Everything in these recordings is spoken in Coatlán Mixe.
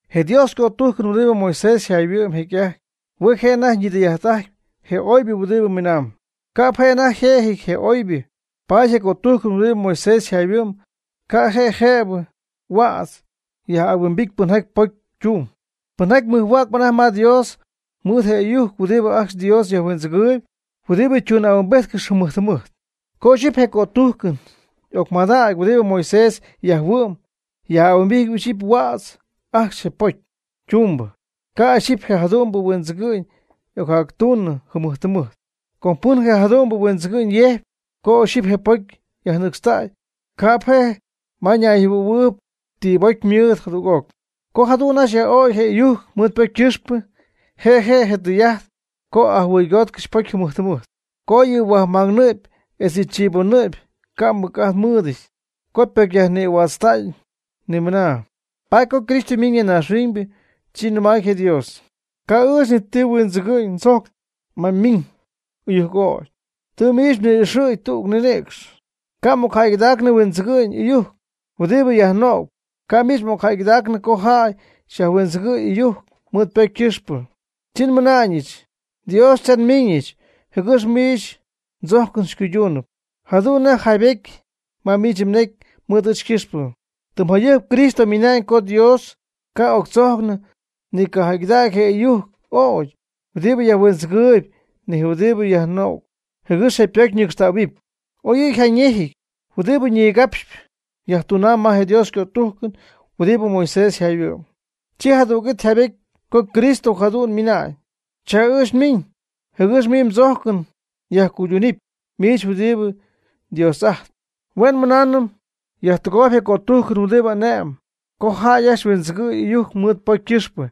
Je Dios ycötujcɨn huɨdibɨ Moisés jayhuɨ'my jecy'ajty, hue' je' anajty ñidɨy'ajt je oybɨ huɨdibɨ miinamb. Ca'p je' anajty yjëjɨty je oybɨ. Paady je cötujcɨn huɨdibɨ Moisés yjayhuɨ'm ca' je' jëbɨ huädz yaj'ahuimbity pɨnjaty pocy ytumb, pɨnjaty mɨjhuäcp anajty ma Dios mɨɨd je ɨyujc huɨdibɨ ajcxy Dios yajhuindzɨgɨɨyb, huɨdibɨ ytun'ahuimbijtcɨxyp jɨmɨjt jɨmɨjt. Co ixyipy je cötujcɨn y'ocmadägy huɨdibɨ Moisés yjayhuɨ'm yaj'ahuimbity ixyipy huädz ajcxy je pocy ytumbɨ, ca' ixyipy je jadu'mbɨ huindzɨgɨ'ñ y'ocyajtuunɨ jɨmɨjt jɨmɨjt. Com pɨn je jadu'mbɨ huindzɨgɨ'ñ yejcp, co ixyipy je' ypocy yajnɨcxtäy, ca'p je' ma ñayjɨhuɨ̈huɨɨyb ti bocy mɨɨdɨty jadüg'oc. Co jadu'n yaj'öccɨxy je ɨyujc mɨɨd ypocy ycɨxpɨ, je' je' je tɨy'ajt co ajɨhuɨygóotɨgɨxy ypocy jɨmɨjt jɨmɨjt. Com yɨ huaj mang ñɨ'py etz yɨ chivo ñɨ'py ca' mɨc'ajt mɨɨdɨty co pocyyajnɨcxtähuɨpy nimɨna. Paady co Cristo ymiiñ ya naaxhuiñ, chi nɨmay je Dios: Ca' miich ni ti huindzɨgɨ'ñ mdzojcnɨ ma ymiiñ ɨyujc'ögy, tɨ miich xyñi'ixɨɨyɨch tüg ninïcx. Ca' m'ocjäygɨdaacnɨ huindzɨgɨ'ñ ɨyujc huɨdibɨ yajno'cp. Ca' miich m'ocjäygɨdaacnɨ co jäy xyajhuindzɨgɨy ɨyujc mɨɨd ypocy ycɨxpɨ. Chi nmɨna'ñɨch: “Dios, cha nmiiñɨch jɨgɨx miich mdzojcɨn yajcuydunɨpy, jadu'n nej yjaybetyɨty ma miich mnecy mɨɨd ɨɨch ycɨxpɨ.” Tɨm jayɨjp, Cristo ymɨna'ñ co Dios ca' octzojcnɨ, ni cajäygɨdägy je ɨyujc ögy huɨdibɨ yajhuindzɨgɨɨyɨp, ni je huɨdibɨ yajno'cp, jɨgɨx je pocyñɨcxtähuɨpy, oy yɨ' yjajëjɨty huɨdibɨ ñigapxy yajtunɨpy ma je Dios ycötujcɨn huɨdibɨ Moisés yjayhuɨ'm. Chi jada' jadüg'it yjaybetyɨty co Cristo jadu'n ymɨna'ñ: “Cha ɨɨch nmiiñ, jɨgɨx miich mdzojcɨn yajcuydunɨpy, miich huɨdibɨ Dios'ajtp.” Hue' mɨnaanɨm, yajtɨgoy je cötujcɨn huɨdidɨ ane'mb co jäy ajcxy huindzɨgɨɨy ɨyujc mɨɨd ypocy ycɨxpɨ,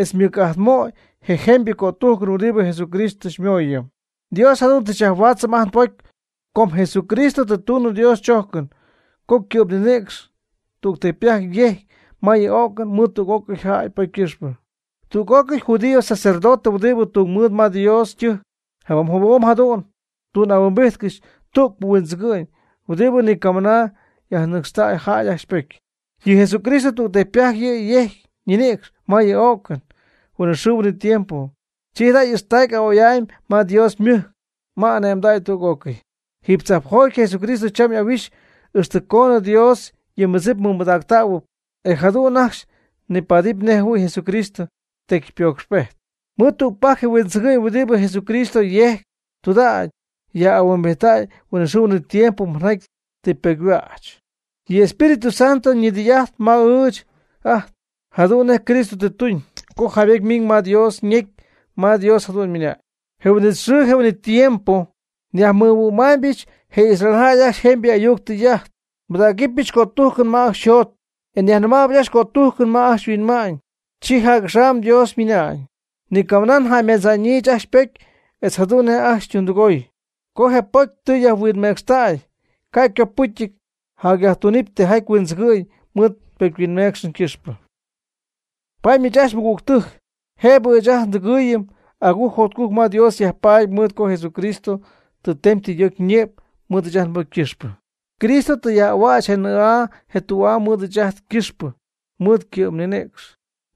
etz mɨc'ajt mo' je jemybɨ cötujcɨn huɨdibɨ Jesucristo xymooyɨm. Dios jadu'n tɨ xyajhuaatzɨm ajt nbocy, com Jesucristo tɨ tuunɨ Dios chojcɨn co cɨ'm ñinïcx tügtecypajc yejcy ma yɨ o'cɨn mɨɨd tüg'ócɨy jäy ypocy ycɨxpɨ. Tüg'ócɨy judío sacerdote huɨdibɨ tungmɨɨd ma Dios ytɨjc jabom jabom jadu'n tun'ahuimbijtcɨxy tügpɨ huindzɨgɨ'ñ, huɨdibɨ ni camɨna yajnɨcxtaayɨ jäy ajcxy ypocy. Yɨ Jesucristo tügtecypajc yɨ' yejcy ñinïcx ma yɨ o'cɨn huinɨxɨɨ huinɨtiempo, chi jada' y'ixtacy a'oy'amy ma Dios ymɨjc ma ane'mdäy tüg'ócɨy. Jiiby tzajpjoty Jesucristo cham y'ahuixy, ixtɨ coonɨ Dios yɨ' ymɨdzip mɨmadactaayɨp, e jadu'n ajcxy nipaadɨpy nej jɨhuɨ̈y Jesucristo ytecypocxpejt. Mɨɨd tügpajc je huindzɨgɨ'ñ huɨdibɨ Jesucristo yejc, tudägy yaj'ahuimbijttäy huinɨxɨɨ huinɨtiempo pɨnjaty tɨ ypocyhuäch. Yɨ Espíritu Santo nidɨy'ajtp ma ɨɨch ajt jadu'n nej Cristo tɨ tuñ. Com jaybety miiñ ma Dios ñecy ma Dios jadu'n ymɨna'ñ: Je huin'it xɨɨ je huin'it tiempo nyajmɨhuɨ'maamybɨch je Israel jäy jemybɨ ayuc jemybɨ tɨy'ajt. Nbɨdägɨbɨch ngötujcɨn ma ajcxy yjot, e njayamybɨch ngötujcɨn ma ajcxy yhuinma'ñ. Chi jac'axam Dios ymɨna'ñ: Ni camɨna njäymedzaanɨch ajcxy ypocy, etz jadu'n nej ajcxy ytundɨgooy. Co je pocy tɨ yajhuinmecxtäy, ca'p ycopɨcyɨty yjacyajtunɨpy tijaty huindzɨgɨ'ñ mɨɨd pocyhuinmeecxɨn ycɨxpɨ. Paady miich ajcxy mɨgügtɨjc, jëbɨ ɨɨch ajt ndɨgɨɨyɨm agujc jotcujc ma Dios yajpaady mɨɨd co Jesucristo tɨ temy tɨ yocy ñɨ'py mɨɨd ɨɨch ajt nbocy ycɨxpɨ. Cristo tɨ yaj'ahuäch je nɨɨ'aa je tü'aa mɨɨd ɨɨch ajt ycɨxpɨ mɨɨd ycɨ'm ninïcx,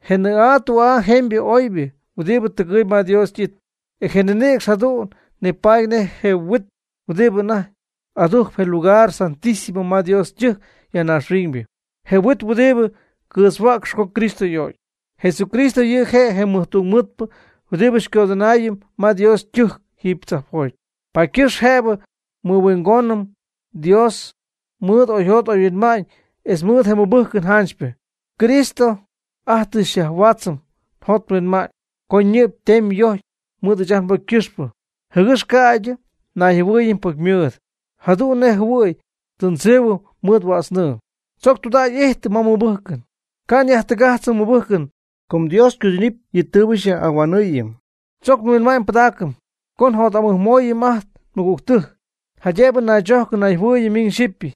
je nɨɨ'aa tü'aa jemybɨ oybɨ huɨdibɨ tɨgɨɨyb ma Dios y'it. E je' yñinïcx jadu'n nipaady nej je huit huɨdibɨ anajty adujcp je Lugar Santísimo ma Dios ytɨjc ya naaxhuiñ, je huit huɨdibɨ cɨɨchhuäcx co Cristo y'o'cy. Jesucristo yɨ' je' je mɨjtungmɨɨdpɨ huɨdibɨ xycodɨnaayɨm ma Dios ytɨjc jiiby tzajpjoty. Paady ycɨxpɨ jëbɨ nmɨhuingoonɨm Dios mɨɨd oyjot oyhuinma'ñ, etz mɨɨd je mɨbɨjcɨn janchypɨ. Cristo ajt tɨ xyajhuaatzɨm njot nhuinma'ñ co ñɨ'py temy yojcy mɨɨd ajt nbocy ycɨxpɨ jɨgɨx ca'ydɨ nayjɨhuɨɨyɨm pocymɨɨd, jadu'n nej jɨhuɨ̈y tɨ ndziihuɨm mɨɨd huädz nɨɨ. Tzoc tudägy n'ijtɨm ma nmɨbɨjcɨn, ca' nyajtɨgajtzɨm nmɨbɨjcɨn, com Dios cuydunɨpy yɨ' tɨɨbɨ xyaj'ahuanɨɨyɨm. Tzoc nhuinma'ñypɨdaacɨm co njot'amɨjmooyɨm ajt nmɨgügtɨjc, jaydëbɨ naychojcɨm nayjɨhuɨɨyɨm miñ xyipy,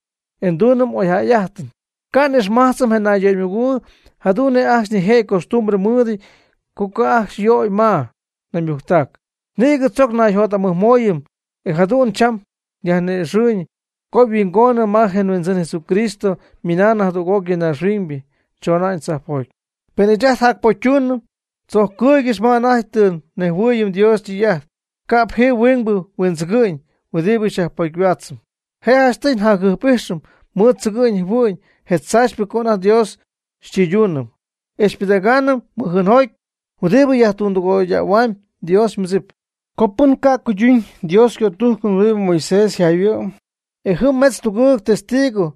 e nduunɨm oyjäy'ajtɨn. Ca' n'ixmajtzɨm je nayyöymugɨɨ, jadu'n nej ajcxy nijëjɨty costumbre mɨɨdɨty co ca' ajcxy yöy ma naymujctac. Nïgɨ tzoc nayjot'amɨjmooyɨm, e jadu'n nej cham yaj'ijxnɨ co yhuingoonɨ ma je Huindzɨn Jesucristo ymiinaanɨ jadüg'oc ya naaxhuiñ, chona'ñ tzajpjoty. Pen ɨɨch ajt jacpocytunɨm tzojcɨngɨ́xy ma anajty tɨ nejhuɨɨyɨm Dios ytɨy'ajt, ca'p ji huingbɨ huindzɨgɨ'ñ huɨdibɨ xyajpocyhuaatzɨm. Je' janchtɨy njacjɨjp'ijxɨm mɨɨd tzɨgɨ'ñ jɨhuɨ'ñ je tzaachypɨ co anajty Dios xytɨydunɨm, e xypɨdaacɨm mɨjjɨɨnjoty huɨdibɨ yajhuindɨgoydähuamb Dios ymɨdzip. Co pɨn cacuyduun Dios ycötujcɨn huɨdibɨ Moisés yjayhuɨ'm, e jɨm metz o tugɨɨg testigo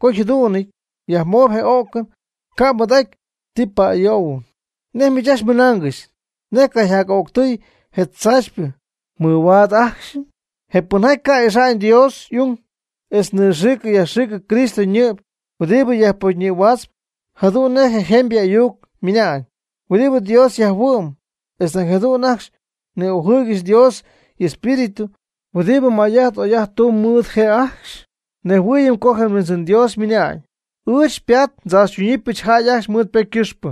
co yjadu'nɨty, yajmoy je' y'o'cɨn ca' mɨɨd'ajty ti pa'ayoohuɨn. ¿Nej miich ajcxy mɨnaangɨxy? ¿Nej cay jac'öctɨy je tzaachypɨ mɨhuaad'ajtcɨxy? Je pɨnjaty ca' ixa'ñ Dios y'ung etz nɨxiicɨ yajxiicɨ Cristo ñɨ'py huɨdibɨ yajpocyñïhuaatzp, jadu'n nej je jemybɨ ayuc ymɨna'ñ huɨdibɨ Dios yajhuɨ'm. Etz nañ jadu'n ajcxy ni'ojɨɨygɨxy Dios yEspíritu huɨdibɨ may'ajt oy'ajt tumb mɨɨd je' ajcxy. Nejhuɨɨyɨm co je Huindzɨn Dios ymɨna'ñ: “Ɨɨch xypatp ndzaachytunɨpyɨch jäy ajcxy mɨɨd ypocy ycɨxpɨ.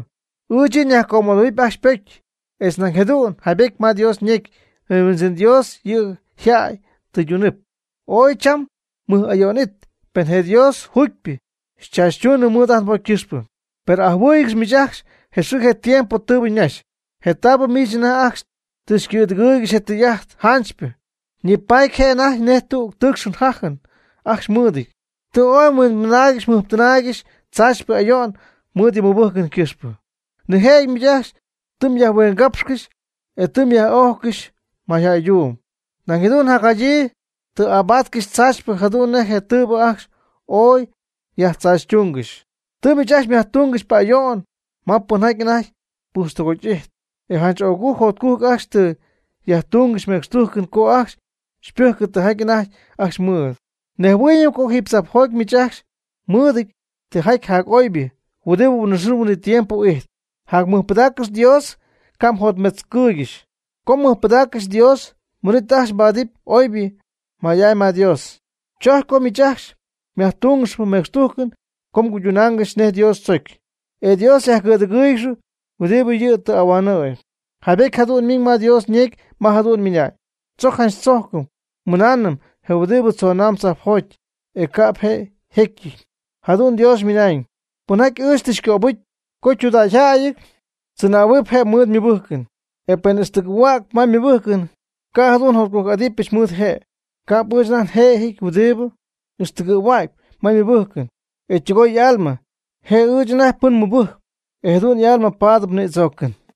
Ɨɨch yɨ' nyajcomɨdohuɨpy ajcxy ypocy.” Etz nañ jadu'n yjaybetyɨty ma Dios ñecy: “Yɨ Huindzɨn Dios yɨ' yjäy tɨydunɨpy.” ¡Ooy chach mɨj y'ayo'nɨty pen je Dios juugypɨ xychaachytunɨm mɨɨd ajt nbocy ycɨxpɨ! Per ajɨhuɨ́ɨyɨgɨxy miich ajcxy je xɨɨ je tiempo tɨɨbɨ ñaxy, je taabɨ miich anajty ajcxy tɨ xycɨ̈dɨgɨ́ɨyɨgɨxy je tɨy'ajt janchypɨ, ñipatyp je' anajty nej tüg tɨɨcxɨn jajɨn ajcxy mɨɨdɨty. Tɨ ooy mhuindɨnaaygɨxy mjɨjptɨnaaygɨxy tzaachypɨ ayo'n mɨɨd yɨ mmɨbɨjcɨn ycɨxpɨ. Nijëjɨty miich ajcxy tɨ myajhuingapxnajxcɨxy, e tɨ myaj'ojcɨxy mayjäyduum. Nañ jadu'n jacjadyii tɨ abaatcɨxy tzaachypɨ jadu'n nej je tɨɨbɨ ajcxy ooy yajtzaachytungɨxy. Tɨ miich ajcxy myajtungɨxy pa'ayo'n ma pɨnjaty anajty pujxtɨgotyɨp, e janch agujc jotcujc ajcxy tɨ myajtungɨxy mecxtujcɨn co ajcxy xypɨjcɨ tijaty anajty ajcxy mɨɨd. Nejhuɨɨyɨm co jiiby tzajpjoty miich ajcxy mɨɨdɨty ti jaty jac'oybɨ huɨdibɨ huinɨxɨɨ huinɨtiempo ijtp. Jacmɨjpɨdaaccɨxy Dios, ca' mjotmetzcɨɨygɨxy. Co mmɨjpɨdáaccɨxɨpy Dios, huin'it ajcxy mbaadɨpy oybɨ may'amy ma Dios. Chojcpy co miich ajcxy myajtúngɨxɨpy mecxtujcɨn co mguydunaangɨxy nej Dios tzocy, e Dios xyajcɨ̈dɨgɨ́ɨygɨxɨp huɨdibɨ yɨ' tɨ ahuanɨ̈y. Jaybety jadu'n ma Dios ñecy ma jadu'n ymɨnañ: Tzojc, janch tzojc ymiina'ñ je huɨdibɨ tzonamb tzajpjoty, e ca'p je' jecyñɨty. Jadu'n Dios ymɨna'ñ: Pɨnjaty ɨɨch tɨ ngöbɨcy co ytudägyjäyɨty, tzɨnähuɨp je' mɨɨd ymɨbɨjcɨn. E pen ixtɨgɨ̈hua'cp ma ymɨbɨjcɨn, ca' jadu'n njotcujc'adɨpyɨch mɨɨd je'. Ca'p ɨɨch ajt njëjɨty huɨdibɨ ixtɨgɨ̈hua'cp ma nmɨbɨjcɨn, e ytɨgoy y'alma, je' ɨɨch ajt pɨn mɨbɨjcp, e jadu'n n'alma paadɨpy nïdzoocɨn.